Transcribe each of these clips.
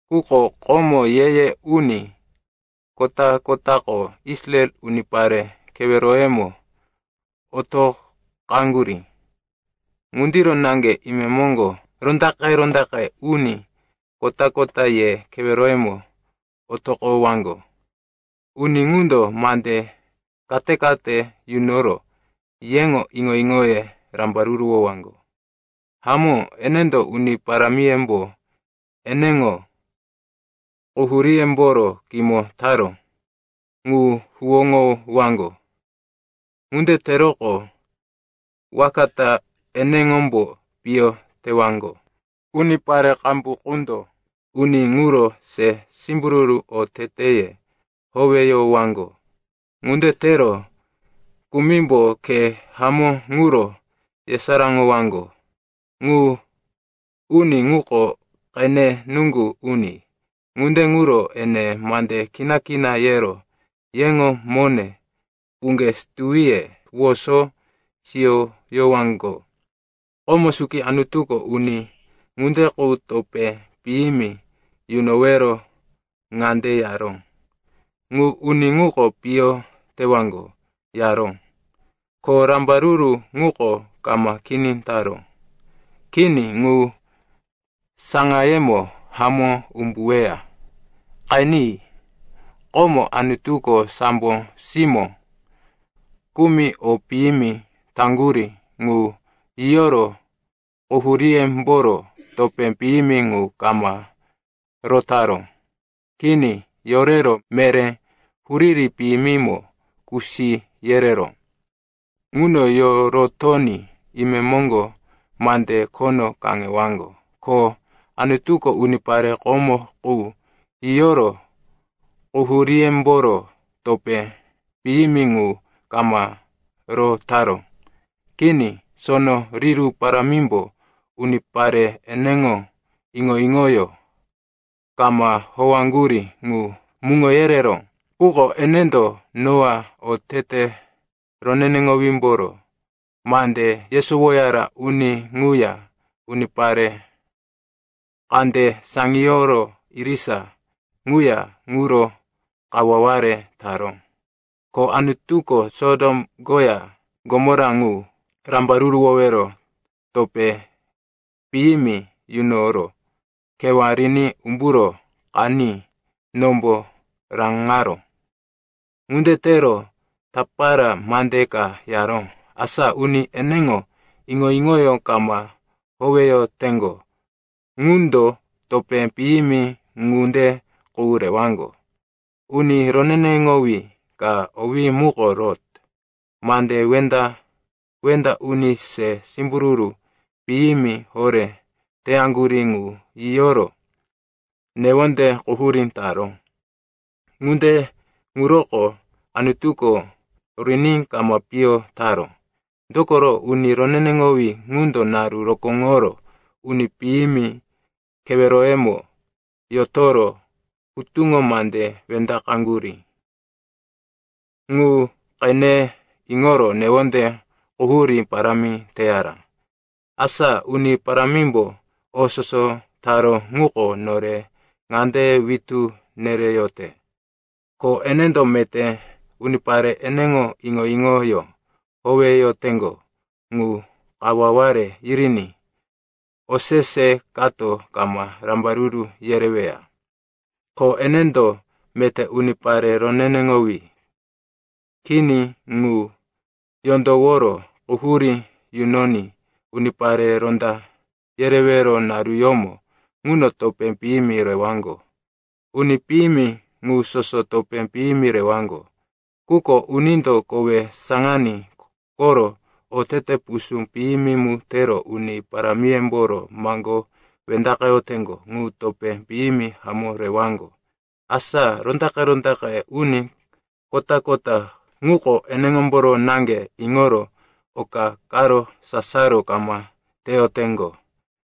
Quko komo ye-ye uni kota-kotako Israel unipare keweroyemo otoqaŋgurí. Ŋundiro naŋge imemoŋgo rondaqe-rondaqe uni kota-kota ye keweroyemo otoqowaŋgo. Uni ŋundo mande kate-kate yunoro yeŋo iŋo-iŋoye rambaruruwowaŋgo. Hamó, enendo Uni Parámiyembo eneŋo quhuríyemboro kimo taró ŋu huwóŋowaŋgo. Ŋunde teroqo, waka ta eneŋombo piyo tewaŋgo. Unipare qambu qundo uni ŋuro se simbururu oteteye howeyowaŋgo. Ŋunde tero kumimbo khe hamó ŋuro yesaráŋowaŋgo. Ŋu uni ŋuko qene nuŋgu uni, ŋunde ŋuro ene mande kina-kina yero yeŋo mone puŋge situwiye woso siyoyowaŋgo. Komo suki Anutuko uni ŋunde qu topé piyimi yunowero ŋande yaró, “Ŋu uni ŋuko piyo tewaŋgo,” yaró. Ko rambaruru ŋuko kama kini taró. Kini, ŋu saŋayemo hamó umbuweya. Qeni, komo Anutuko sambo simó kumi o piyimi taŋgurí ŋu yiyoro quhuríyemboro topé piyimi ŋu kama rotaró. Kini, yorero meré huriri piyimimo kusi yereró. Ŋuno yorotoní imemoŋgo mande khono kaŋewaŋgo. Ko Anutuko unipare komo qu yiyoro quhuríyemboro topé piyimi ŋu kama rotaró. Kini, sono riru parámimbo unipare eneŋo iŋo-iŋoyó kama howaŋgurí ŋu muŋo yereró. Quko enendo Noa, otete roneneŋowímboro mande yesowoyara uni ŋuya unipare kande saŋiyoro irisa ŋuya ŋuro kawaware taró. Ko Anutuko Sotom koya Gomora ŋu rambaruruwowero topé piyimi yunoro kewá riní umburo qaní nombo raŋaró. Ŋunde tero tapara mande ka yaró, asa uni eneŋo iŋo-iŋoyó kama howeyoteŋgo ŋundo topé piyimi ŋunde qu rewaŋgo. Uni roneneŋowí ka, owí muko Lot, mande wenda-wenda uni se simbururu piyimi horé teyaŋgurí ŋu yiyoro newonde quhurí taró. Ŋunde ŋuroko Anutuko riní kama piyo taró. (Dokoro uni roneneŋowí ŋundo naru rokóŋoro uni piyimi keweroyemo yotoro hutuŋo mande wendaqeyaŋgurí ŋu qene iŋoro newonde quhurí parámi teyara.) Asa Uni Parámimbo o soso taró ŋuko nore ŋande witú nereyote, ko enendo meté unipare eneŋo iŋo-iŋoyó howeyoteŋgo ŋu kawaware yiriní osese kato kama rambaruru yereweya. Ko enendo meté unipare roneneŋowí kini ŋu yondoworo quhurí yunoní unipare ronda yerewero naruyómo ŋuno topé piyimi rewaŋgo. Uni piyimi ŋu soso topé piyimi rewaŋgo, quko unindo kowe saŋaní koro otete pusú piyimi mu tero uni parámiyemboro maŋgó wendaqeyoteŋgo ŋu topé piyimi hamó rewaŋgo. Asa rondaqe-rondaqe uni kota-kota ŋuko eneŋomboro naŋge iŋoro oka karo sasaro kama teyoteŋgo.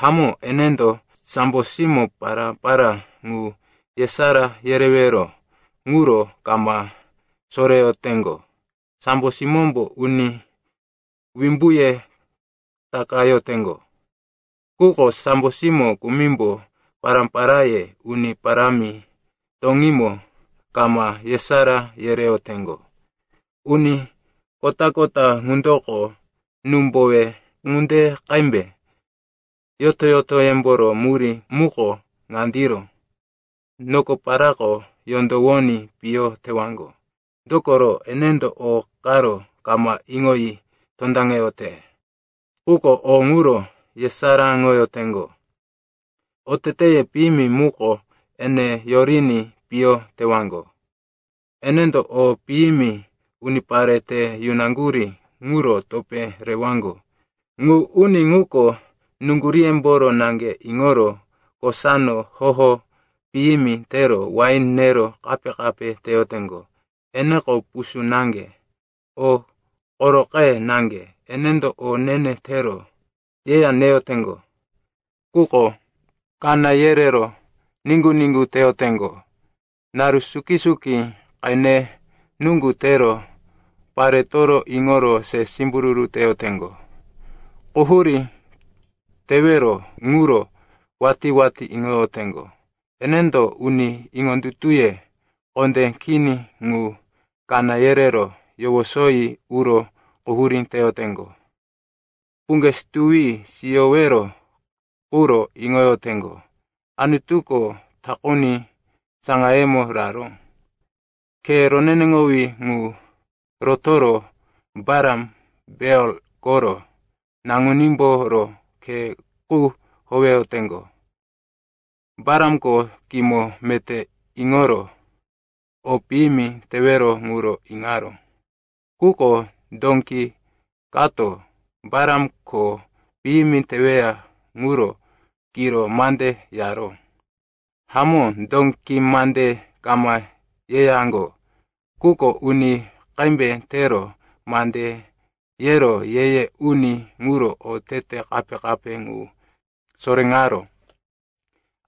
Hamó, enendo sambo simó pará-pará ŋu yesará yerewero ŋuro kama soreyoteŋgo. Sambo simómbo uni wimbuye takayoteŋgo, quko sambo simó kumimbo pará-paráye Uni Parámi toŋímo kama yesará yereyoteŋgo. Uni kota-kota ŋundoko númbowe ŋunde qembe, yoto-yotoyemboro murí muko ŋandiro, nokoparako yondowoní piyo tewaŋgo. Dokoro enendo o karo kama iŋoyi tondaŋeyote, quko o ŋuro yesaráŋoyoteŋgo. Oteteye piyimi muko ene yoriní piyo tewaŋgo. Enendo o piyimi unipare te yunaŋgurí ŋuro topé rewaŋgo. Ŋu uni ŋuko nuŋguríyemboro naŋge iŋoro kosano hoho piyimi tero wain nero kape-kape teyoteŋgo. Eneko pusú naŋge, o koroqe naŋge, enendo o ne-ne tero yeya neyoteŋgo, quko kaná yerero niŋgu-niŋgu teyoteŋgo. Naru suki-suki qene nuŋgu tero paretoro iŋoro se simbururu teyoteŋgo. Quhurí tewero ŋuro watí-watí iŋoyoteŋgo. Enendo uni iŋondutuye kondé kini ŋu kaná yerero yowosoyi uro quhurí teyoteŋgo. Puŋge situwi siyowero quro iŋoyoteŋgo. Anutuko takuni saŋayemo raró. Khe roneneŋowí ŋu rotoro Balam, Beor koro naŋunímboro khe qu howeyoteŋgo. Balamko kimo meté iŋoro o piyimi tewero ŋuro iŋaró. Quko dóki kato Balam kho piyimi teweya ŋuro kiro mande yaró. Hamó, dóki mande kama yeyaŋgo, quko uni qembe tero mande yero ye-ye uni ŋuro otete kape-kape ŋu soréŋaró.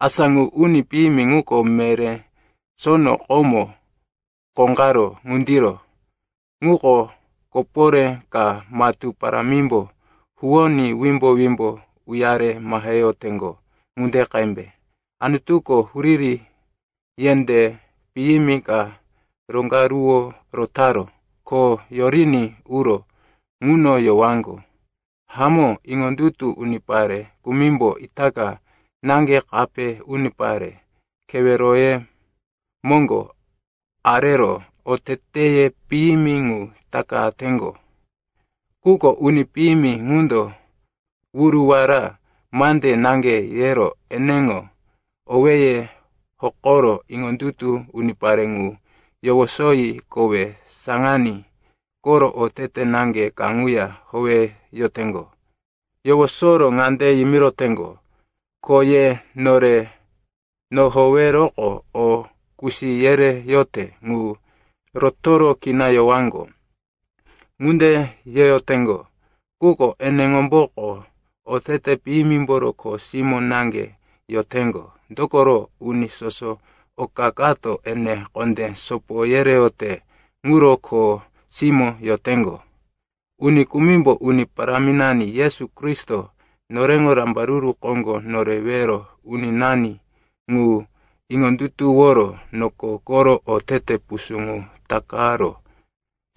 Asa ŋu uni piyimi ŋuko meré sono komo kóqaró ŋundiro, ŋuko koporé ka matú parámimbo huwoní wimbo-wimbo uyare maheyoteŋgo ŋunde qembe. Anutuko huriri yendé piyimi ka roŋgaruwo rotaró, ko yoriní uro ŋuno yowaŋgo. Hamó, iŋondutu unipare kumimbo itaka naŋge kape unipare keweroye moŋgo arero oteteye piyimi ŋu takateŋgo. Quko uni piyimi ŋundo wuruwara mande naŋge yero eneŋo owéye hokoro iŋondutu unipare ŋu yowosoyi kowe saŋaní koro otete naŋge kaŋuya howeyoteŋgo. Yowosoro ŋande yimiroteŋgo, “Ko ye nore nohoweroqo o kusi yereyote ŋu rotoro kina yowaŋgo.” Ŋunde yeyoteŋgo, quko eneŋomboko otete piyimimboro kho simó naŋge yoteŋgo, dokoro uni soso oka kato ene kondé sopo yereyote ŋuro kho simó yoteŋgo. Uni kumimbo Uni Paráminani Yesu Kristo, noreŋo Rambaruru Koŋgo Norewero Uninani ŋu iŋondutuworo noko koro otete pusú ŋu takaro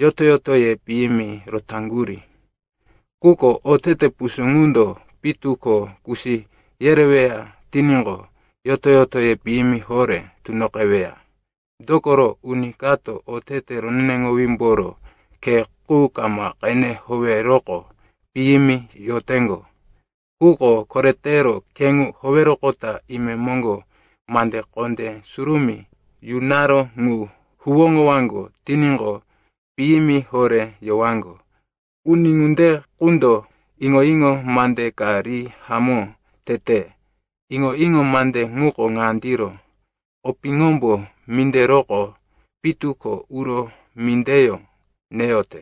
yoto-yotoye piyimi rotaŋgurí. Quko otete pusú ŋundo pitu ko kusi yereweya tiníqo, yoto-yotoye piyimi horé tunoqeweya. Dokoro uni kato otete roneneŋowímboro khe qu kama qene howeroqo piyimi yoteŋgo. Quko koretero khe ŋu howeroqota imemoŋgo mande kondé surumí yunaró ŋu huwóŋowaŋgo tiníqo, piyimi horé yowaŋgo. Uni ŋunde qundo iŋo-iŋo mande ka ri hamó tete. Iŋo-iŋo mande ŋuko ŋandiro, “Opiŋombo minderoqo pitu ko uro mindeyó neyote.”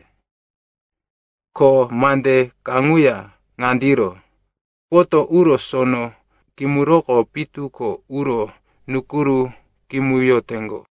Ko mande kaŋuya ŋandiro, “Poto uro sono kimuroqo pitu ko uro nukuru kimuyoteŋgo.”